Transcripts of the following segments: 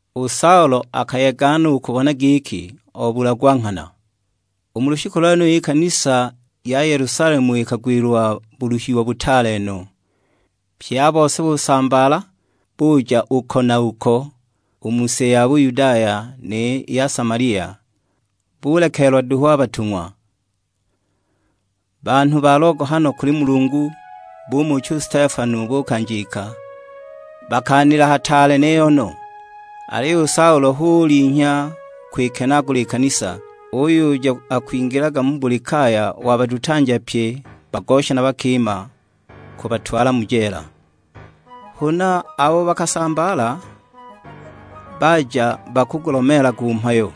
U Saulo akayega no u kubona giki, obulagwa nghana. U mu lushiku lwenulo i kanisa ya Yelusalemu ikagwilwa buluhiwa butaale no, pye a bose busambaala, buja uko na uko u mu si ya Buyudaya ni ya Samalia; bulekeelwa duhu a batung'wa. Banhu ba logohano kuli Mulungu bumucha u Stefano bukanjika; bakaanila hataale niyo no! Aliyo u Saulo hu ulinhya kwikenaagula i kanisa, uyuja akwingilaga mu buli kaya wabadutanja pye bagosha na bakima, kubatwala mu jeela! Huna, abo bakasambaala, baja bakugulomeelaga u Mhayo.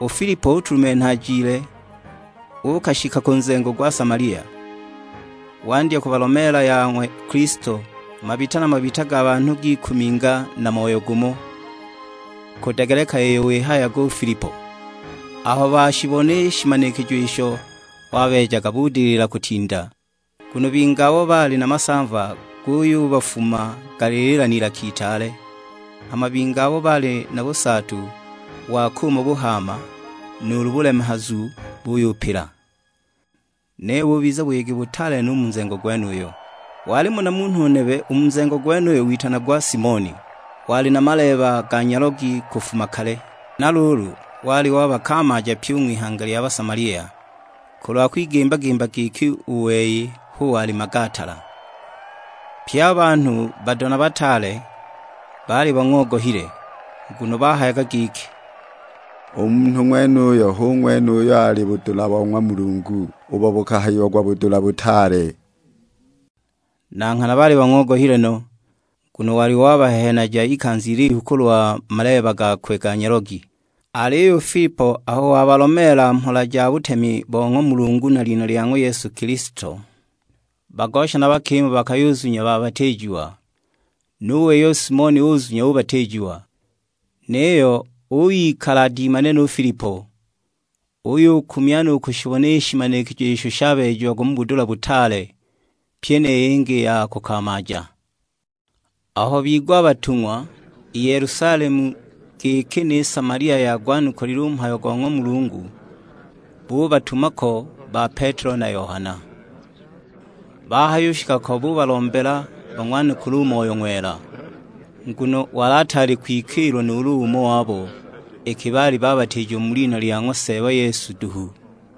U Filipo utulumenha ajile, uukashika ku nzengo gwa Samalia, wandya kubalomeela ya ng'wa Kilisto. Mabita na mabita ga banhu gikuminga na moyo gumo, kudegeleka iyo wihayaga u Filipo. Aho bashibona i shimanikijo isho wabeejaga budilila kutinda. Nguno bingi abo baali na masamva guyubafuma galilila n'ilaka itaale, hama bingi abo baali na busaatu wa kuuma buhaama nuulu bulemehazu buyupila. Niyo bubiza buyegi butaale no u mu nzengo gwenuyo. Walimo na munhu nebe u mu nzengo gwenuyo witanagwa Simoni, wali na maleeba ga nyalogi kufuma kale; na luulu wali wabakamaaja pyi u ng'wihanga lya Basamalia, kulwa kwigimba-gimba giki u wei hu wali magaatala! Pye a banhu, bado na bataale, baali bang'ogohile; nguno bahayaga giki, "U munhu ng'wenuyu hu ng'wene uyo ali budula bo ng'wa mulungu, ubo bukahayiagwa 'Budula Butaale!' " Na nghana baali bang'ogohile no, nguno wali wabahehenaja ikanza ilihu kulwa maleeba gakwe ga nyalogi. Aliyo u Filipo aho wabalomeela mhola ja butemi bo ng'wa Mulungu na lina lya ng'wa Yesu Kilisto, bagosha na bakima bakayuzunya babatiijiwa. Nu wei u Simoni uzunya ubatiijiwa, niyo uyikala adimanile nu Filipo; uyukumya no u kushibona i shimanikijo isho shabeejiagwa mu budula butaale, pyi ni yingi i ya kukamaaja. Aho bigwa a batung'wa i Yelusalemu giki ni Samalia yagwanukulile u Mhayo go ng'wa Mulungu, bubatuma ko ba Petelo na Yohana. Bahayushika ko bubalombela bang'wanukule u Moyo Ng'wela; nguno wali ataali kwikiilwa nuulu umo wabo, iki baali babatiijiwa mu lina lya ng'wa Seeba Yesu duhu.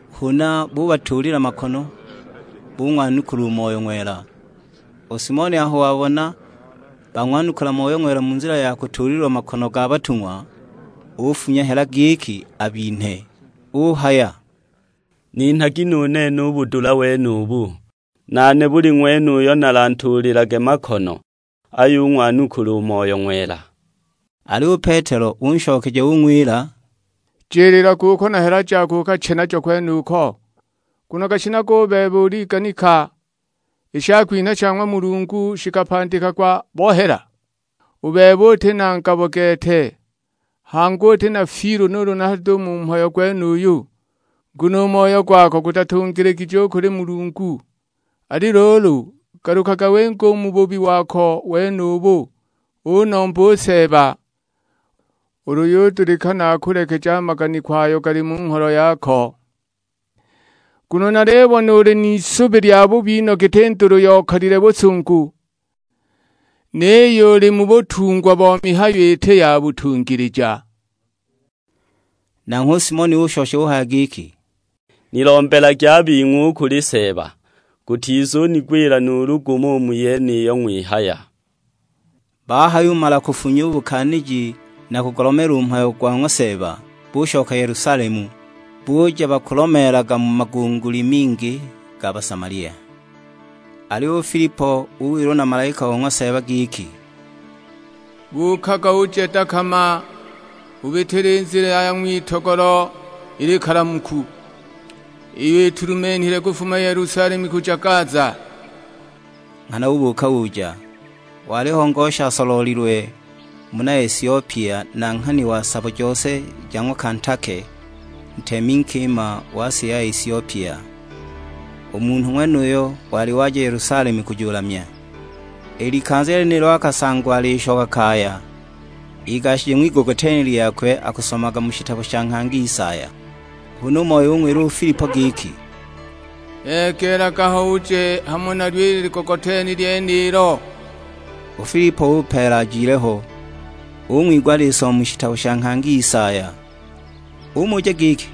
Huna bubatuulila makono, bung'wanukula u Moyo Ng'wela. U Simoni aho wabona bang'wanukula Moyo Ng'wela mu nzila ya kutuulilwa makono ga batung'wa, ufunya hela giki abinhe. Uhaya, "Ninhagi nu nene u budula wenubu; nane buli ng'wene uyo nalantuulilage makono ayung'wanukula u Moyo Ng'wela!" Aliyo u Petelo unshokeja ung'wila, "Jiliilaga uko na hela jako ukache najo kwenuko; nguno gashinaga u bebe uliganika, i shakwinha sha ng'wa Mulungu shikapandikagwa bo hela. U bebe uti na ngabo gete, hangi uti na fiilu nuulu hado u mu mhayo gwenuyu; nguno u moyo gwako gutatungiligije u kuli Mulungu. Ali luulu, galukaga winge u mu bubi wako wenubu, unombe u Seeba, ulu yudulikana akulekeje a maganiko ayo gali mu ngholo yako. Nguno nalibona uli n'isubi lyabubi no giti ndulu yokalile busungu, niyo uli mu butungwa bo mihayo iti ya butungilija!" Nanghwe u Simoni ushosha uhaya giki, "Nilombelagi a bing'we u kuli Seeba, gutizunigwila nuulu gumo u mu yeniyo ng'wihaya!" Bahayumala kufunya u bukaaniji na kugulomeela u mhayo go ng'wa Seeba, bushoka Yelusalemu, buja bakulomeelaga mu magunguli mingi ga Basamalia. Aliyo u Filipo uwilwa na malaika o ng'wa Seeba giki, "Buukaga uje dakama; ubitile i nzila ya ng'witogolo i likalamuku, iyo itulumenhile kufuma Yelusalemu kuja Gaza." Nghana ubuuka uja; waliho ngosha asoloolilwe, muna Esiopia, nanghani wa sabo jose ja ng'wa Kantake, ntemi nkima wa si ya Esiopia; u munhu ng'wenuyo wali waja Yelusalemu kujulamya. I likanza lyenilo akasangwa alishoka kaya, igashije ng'wigogoteni lyakwe akusomaga mu shitabo sha nghangi Isaya. Huna u Moyo ung'wila u Filipo giki, "Egeelaga ho uje hamo nalyo i ligogoteni lyenilo." U Filipo upeela ajile ho, ung'wigwa alisoma mu shitabo sha nghangi Isaya; umuja giki,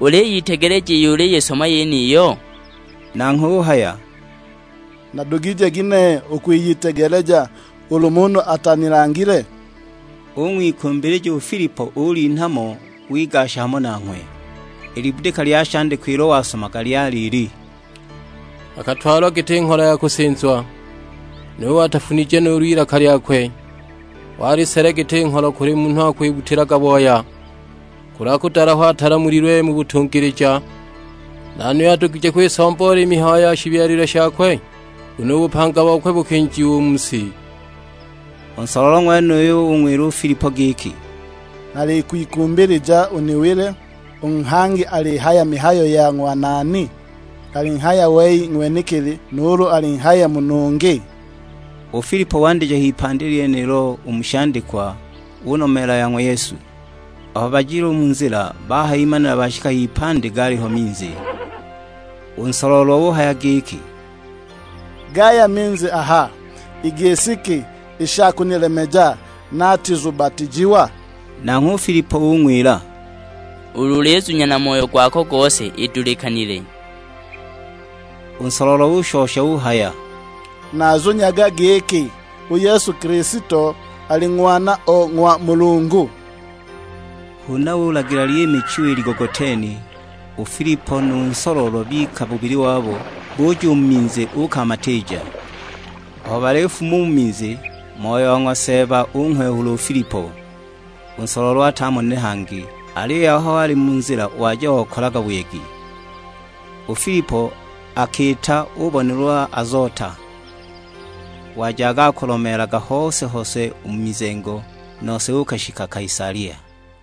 "Uliyitegeleja iyo uliyisoma yeniyo?" Nanghwe uhaya, "Nadugije ginehe u kwiyitegeleja ulu munhu atanilangile?" Ung'wikumbilija u Filipo ulinha mo wigasha hamo nanghwe. I libudika lya shandikwa ilo wasomaga lyali ili; "Akatwalwa giti ngholo ya kusinzwa, nuwe atafunije nuulu ilaka lyakwe, wali sele giti ngholo kuli munhu akwibbutilaga booya. Kulwa kudalahwa atalamulilwe mu butungilija; nani uyo adugije kwisomboola i mihayo ya shibyalilwe shakwe? Nguno u bupanga bokwe bukinjiwa u mu si!" U nsoloolwa ng'wenuyo ung'wila u Filipo giki, "Nalikwikumbilija uniwile, u nghangi alihaya mihayo ya ng'wa nani? Alihaya wei ng'wenekili, nuulu alinghaya munhu ungi?" U Filipo wandija h'ipandi lyenilo u mu shandikwa, unomeela ya ng'wa Yesu. Aho bajile u mu nzila, bahayimanila bashika h'ipandi galiho minzi; u nsoloolwa uhaya giki, "Gaya minzi aha, i gisi ki i sha kunilemeja natizubatiijiwa?" [ Nanghwe u Filipo ung'wila, "Ulu ulizunya na moyo gwako gose idulikanile." U nsoloolwa ushosha uhaya, "Nazunyaga giki u Yesu Kilisto ali Ng'wana o ng'wa Mulungu."] Huna ulagila lyimichiwa i ligogoteni; u Filipo nu nsoloolwa bika bubili wabo, buja u mu minzi uukamatiija. Aho balifuma u mu minzi, Moyo wa ng'wa Seeba unghwehula u Filipo; u nsoloolwa atamonile hangi, aliyo aho ali mu nzila waja okalaga buyegi. U Filipo akiita ubonelwa Azota, wajaga akulomeelaga hose-hose u mu mizengo, nose uukashika Kaisalia.